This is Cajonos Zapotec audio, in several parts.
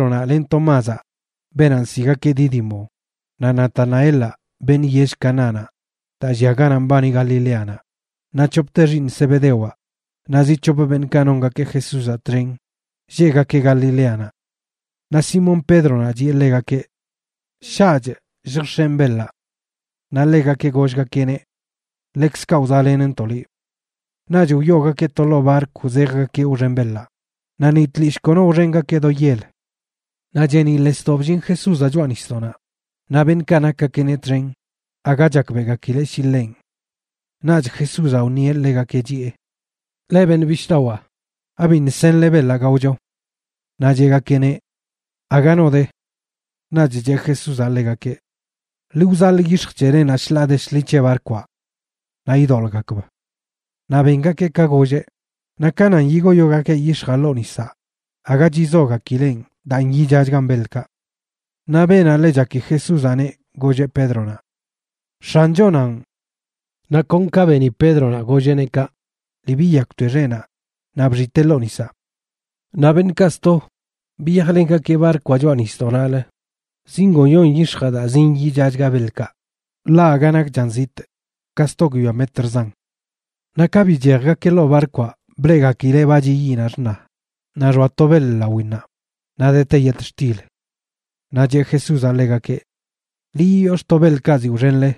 Simón Pédronaꞌ len Tomázaꞌ, beenaꞌ nsiꞌgakeꞌ Dídimo, naꞌ Natanaelaꞌ, beṉꞌ yell Canánaꞌ daa llia ganaꞌ mbani Galileanaꞌ, naꞌ c̱hopte xiiṉ Zebedewaꞌ naꞌ zi c̱hop beṉꞌkaꞌ nongakeꞌ Jesúzaꞌ txen lleꞌgakeꞌ Galileanaꞌ. Naꞌ Simón Pédronaꞌ chiꞌe ḻegakeꞌ: ―Shaꞌchꞌ lljx̱enꞌ beḻaꞌ. Naꞌ ḻegakeꞌ gollgakeꞌneꞌ: ―Ḻekzkaꞌ wzaꞌlenntoꞌ liꞌ. Naꞌch wyoogakeꞌ to ḻoo barkw zejgakeꞌ wxen beḻaꞌ, naꞌ ni tlishꞌ kono wxengakeꞌ do yel. Naꞌ cheeniꞌḻesdoꞌ bllin Jesúzaꞌ choꞌa nisdoꞌnaꞌ, naꞌ beṉꞌkaꞌ nakgakeꞌneꞌ txen aga chakbeꞌgakileꞌ shi ḻenꞌ. Naꞌch Jesúzaꞌ wṉieꞌ ḻegakeꞌ, chiꞌe: ―Leꞌ beṉꞌ bishꞌdawaa, ¿abiṉꞌ senle beḻaꞌ gaocho? Naꞌ cheꞌgakeꞌneꞌ: ―Aga no de. Naꞌch cheꞌ Jesúzaꞌ ḻegakeꞌ: ―Ḻi wzaḻꞌ yix̱j c̱helenaꞌ shḻaa de shḻi c̱he barkwaꞌ naꞌ idoḻꞌgakb. Naꞌ bengakeꞌ ka golleꞌ, naꞌ ka nan yigoyogakeꞌ yix̱jaꞌ ḻoo nisaꞌ aga chizogakileꞌn daa nyichachgan beḻkaꞌ. Naꞌ beenaꞌ ḻe chaki Jesúzaꞌneꞌ, golleꞌ Pédronaꞌ: ―¡X̱anchonanꞌ! Naꞌ kon ka beni Pédronaꞌ golleꞌneꞌ kaꞌ, lii biyakwte xeꞌnaꞌ, naꞌ bxitee ḻoo nisaꞌ. Naꞌ beṉꞌkaꞌ sto biyajlengakeꞌ barkwaꞌ choꞌa nisdoꞌnaꞌlə, zingoyon yix̱jaꞌ daa zinyichachga beḻkaꞌ, ḻaꞌ aga nakchan zitꞌ, ka sto guiyoa metrzan. Naꞌ ka bichejgakeꞌ ḻoo barkwaꞌ, bleꞌgakileꞌ ba chiꞌ yiꞌnaꞌ xṉa naꞌ xoa to beḻ lawinnaꞌ, naꞌ dete yetxtil. Naꞌ cheꞌ Jesúzaꞌ ḻegakeꞌ: ―Ḻi yiyox̱ꞌto beḻkaꞌ ziꞌ wxenle.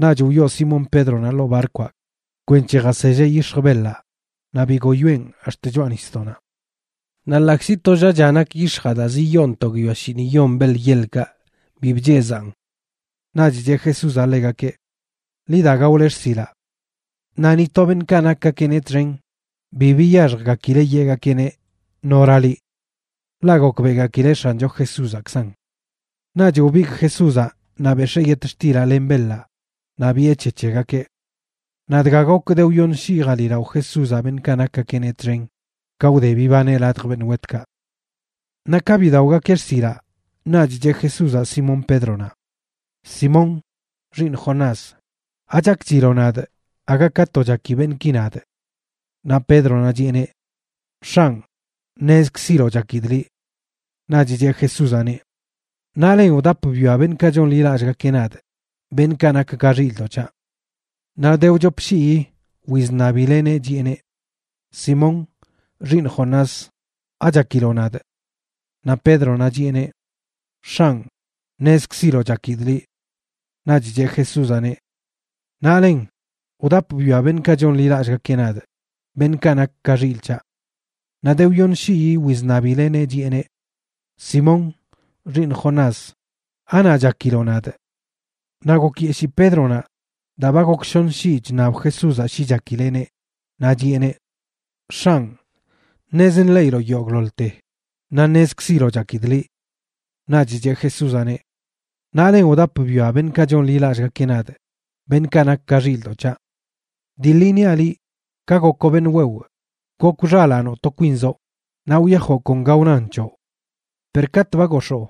Naꞌch wyoo Simón Pédronaꞌ ḻoo barkwaꞌ kwenc̱he jaselleꞌ yix̱j beḻaꞌ naꞌ bigoyoeꞌn ax̱t choꞌa nisdoꞌnaꞌ. Naꞌ ḻaꞌkzi tollaꞌcha nak yix̱jaꞌ daa ziyoon to guiyoa shiiṉiyon beḻ yeḻkaꞌ, bi bchezaꞌn. Naꞌch cheꞌ Jesúzaꞌ ḻegakeꞌ: ―Ḻi da gaole xsilaꞌ. Naꞌ ni to beṉꞌkaꞌ nakgakeꞌneꞌ txen bi biyaxjgakileꞌ yeꞌgakeꞌneꞌ: “¿Nora liꞌ?” Ḻaꞌ gokbeꞌgakileꞌ X̱ancho Jesúzaꞌkzanꞌ. Naꞌch wbigꞌ Jesúzaꞌ naꞌ bex̱ee yetxtilaꞌ len beḻaꞌ naꞌ biꞌe c̱he c̱hegakeꞌ. Naꞌ dga gok de wyoṉ shii jaliꞌlao Jesúzaꞌ beṉꞌkaꞌ nakgakeꞌneꞌ txen ka wde bibaneꞌ ladj beṉꞌ wetkaꞌ. Naꞌ ka bidaogakeꞌ xsilaꞌ, naꞌch cheꞌ Jesúzaꞌ Simón Pédronaꞌ: ―Simón, xiiṉ Jonás, ¿achakchiloꞌ nadꞌ aga ka to chaki beṉꞌki nadꞌ? Naꞌ Pédronaꞌ chiꞌeneꞌ: ―X̱anꞌ, ṉezkziloꞌ chakidꞌ liꞌ. Naꞌch cheꞌ Jesúzaꞌneꞌ: ―Naꞌlen wdap bwia beṉꞌkaꞌ chonḻilallꞌgakeꞌ nadꞌ, beṉꞌkaꞌ nak ka xilꞌdoꞌ c̱haꞌ. Naꞌ de wchop shii wizṉabileꞌneꞌ, chiꞌeneꞌ: ―Simón, xiiṉ Jonás, ¿achakiloꞌ nadꞌ? Naꞌ Pédronaꞌ chiꞌeneꞌ: ―X̱anꞌ, ṉezkziloꞌ chakidꞌ liꞌ. Naꞌch cheꞌ Jesúzaꞌneꞌ: ―Naꞌlen wdap bwia beṉꞌkaꞌ chonḻilallꞌgakeꞌ nadꞌ, beṉꞌkaꞌ nak ka xilꞌ c̱haꞌ. Naꞌ de wyoṉ shii wizṉabileꞌneꞌ, chiꞌeneꞌ: ―Simón, xiiṉ Jonás, ¿anaꞌ chakiloꞌ nadꞌ? Naꞌ gokyeshii Pédronaꞌ daa ba gok shoṉ shii chṉab Jesúzaꞌ shi chakileꞌneꞌ, naꞌ chiꞌeneꞌ: ―X̱anꞌ, ṉez nḻeꞌiloꞌ yogꞌḻoḻte, naꞌ ṉezkziloꞌ chakidꞌ liꞌ. Naꞌch cheꞌ Jesúzaꞌneꞌ: ―Naꞌlen wdap bwia beṉꞌkaꞌ chonḻilallꞌgakeꞌ nadꞌ, beṉꞌkaꞌ nak ka xilꞌdoꞌ c̱haꞌ. Dii ḻi niaꞌ liꞌ, ka gokoꞌ beṉꞌ wewꞌ, gokw xalaanoꞌ to kwinzoꞌ naꞌ wyajoꞌ kon ga wnan c̱hoꞌ. Per katꞌ ba gox̱oo,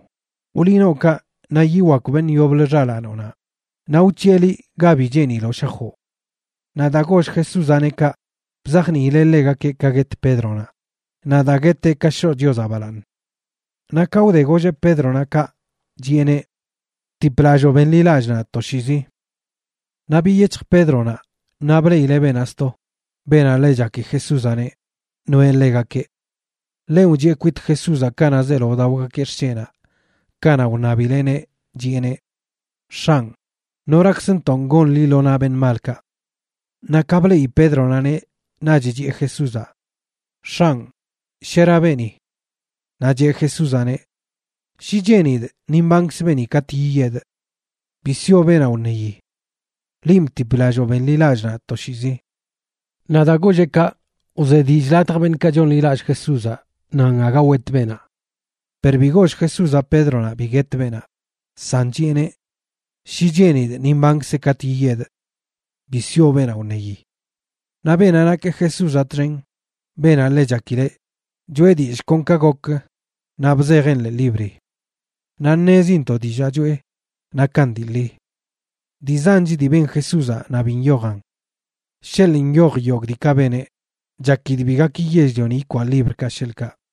wḻi nookaꞌ naꞌ yiwakw beṉꞌ yoblə xalaanoꞌnaꞌ, naꞌ wc̱hiꞌe liꞌ ga bi cheeniloꞌ shajoꞌ. Naꞌ daa goll Jesúzaꞌneꞌ kaꞌ, bzajniileꞌ ḻegakeꞌ ka guet Pédronaꞌ, naꞌ daa gueteꞌ kaꞌ shoꞌ Chiozaꞌ balaaṉ. Naꞌ ka wde golleꞌ Pédronaꞌ kaꞌ, chiꞌeneꞌ: ―Btiplalloo benḻilallꞌ nadꞌ toshiizi. Naꞌ biyec̱hj Pédronaꞌ naꞌ bleꞌileꞌ beenaꞌ sto, beenaꞌ ḻe chaki Jesúzaꞌneꞌ, noeꞌ ḻegakeꞌ. Ḻenꞌ wchiꞌe kwit Jesúzaꞌ kanaꞌ zeelo wdaogakeꞌ xsheꞌnaꞌ kanaꞌ wṉabileꞌneꞌ, chiꞌeneꞌ: “X̱anꞌ, ¿norakzntonꞌ gon liꞌ lo naꞌ beṉꞌ malkaꞌ?” Naꞌ ka bleꞌi Pédronaꞌneꞌ, naꞌch chiꞌe Jesúzaꞌ: ―X̱anꞌ, ¿shera beeni? Naꞌ cheꞌ Jesúzaꞌneꞌ: ―Shi cheenidꞌ, ni mbankz beeni katꞌ yiyedꞌ. Bi sioꞌ beenaꞌ wṉeyi. Linꞌ btiplalloo benḻilallꞌ nadꞌ toshiizi. Naꞌ daa golleꞌ kaꞌ, wze dillꞌ ladj beṉꞌkaꞌ chonḻilallꞌ Jesúzaꞌ nan aga wet beenaꞌ. Per bi goll Jesúzaꞌ Pédronaꞌ bi guet beenaꞌ, san chiꞌeneꞌ: “Shi cheenidꞌ, ni mbankzeꞌ katꞌ yiyedꞌ. Bi sioꞌ beenaꞌ wṉeyi.” Naꞌ beenaꞌ nakeꞌ Jesúzaꞌ txen, beenaꞌ ḻe chakileꞌ, choꞌe dillꞌ kon ka gokə naꞌ bzejeꞌn ḻee libri. Naꞌ ṉezintoꞌ dillaa choꞌe nakan dii ḻi. Dii zanch dii ben Jesúzaꞌ naꞌ bi nyojan. Sheḻꞌ nyoj yogꞌ diikaꞌ beneꞌ, chakidꞌ bi gaki yell-lioni ikwaꞌ librkaꞌ sheḻꞌkaꞌ.